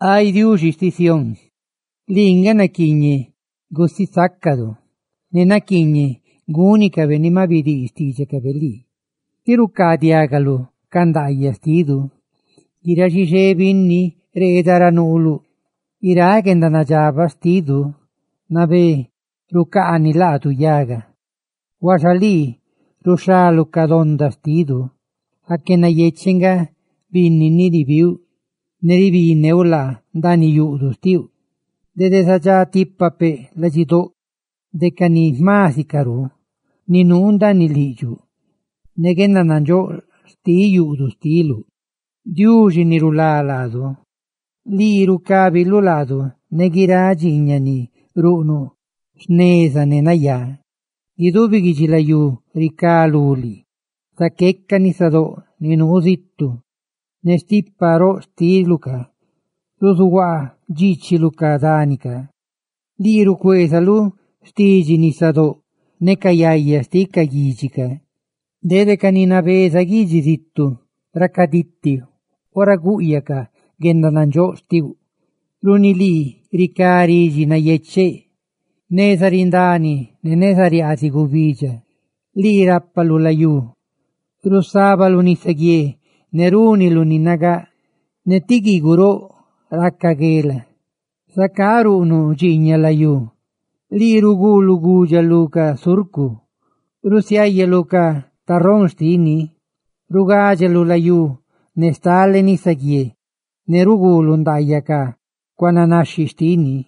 Ay Diuxi xtiꞌ Sión, ¡lii nga naquiiñeꞌ gusisácadu!, ¡ne naquiiñeꞌ gúnicabe ni maꞌ bidii xtiidxacabe lii, tí rucaadiagaluꞌ diidxaꞌ ndaayaꞌ! Guiráꞌ xixé binni reeda ra nuuluꞌ. Guiráꞌ guendanadxabaꞌ xtidu nabé rucaani laadu yaga, huaxa lii ruxhaluꞌ ca donda xtidu. Aque nayecheꞌ nga binni ni ribiuꞌ ne ribiꞌneuꞌ laa cueꞌluꞌ, ndaaniꞌ yuꞌduꞌ xtiuꞌ. ¡Dede zadxá tipa peꞌ ladxidoꞌdo de ca ni jma sicarú ni nuu ndaaniꞌ liꞌdxuꞌ, ne guendanandxóꞌ xtiꞌ yuꞌduꞌ xtiluꞌ! Diuxi ni rulá laadu, lii rucábiluꞌ laadu ne guiráꞌ dxiiñaꞌ ni ruꞌnuꞌ jneza ne nayá; guidubi guidxilayú ricá lú lii, zaqueca nisadóꞌ ni nuu zitu; ne stipa roꞌ xtiluꞌ, ruzuhuaa dxiichiluꞌ ca dani. Lii rucueezuꞌ xtidxi nisadóꞌ ne guendaraca yaya xtiꞌ ca guidxi; dede ca ni nabeza guidxi zitu racaditi ora gúꞌyacaꞌ guendanandxóꞌ xtiuꞌ; runi lii ricá ridxi nayecheꞌ neza rindani ne neza riaaziꞌ gubidxa. Lii rápaluꞌ layú; rusabaluꞌ nisaguié ne rúniluꞌ ni nagáꞌ; ne ca guiiguꞌ roꞌ, rusiniisiluꞌ guela. ¡Zacá ruꞌnuꞌ dxiiñaꞌ layú! Lii ruguuluꞌ gudxa lu ca surcu, rusiáyaluꞌ ca tarrón xtini; rucuudxiluꞌ layú ne stale nisaguié, ne ruguuluꞌ ndaayaꞌ ca cuaananaxhi xtini.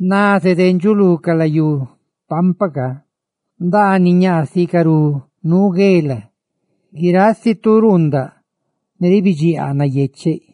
naze dendxuꞌ lu ca layú paampa, ndaaniꞌ ñaa sicarú nuu guela; ¡guiráꞌ si tu ruundaꞌ ne rucaa ridxi nayecheꞌ!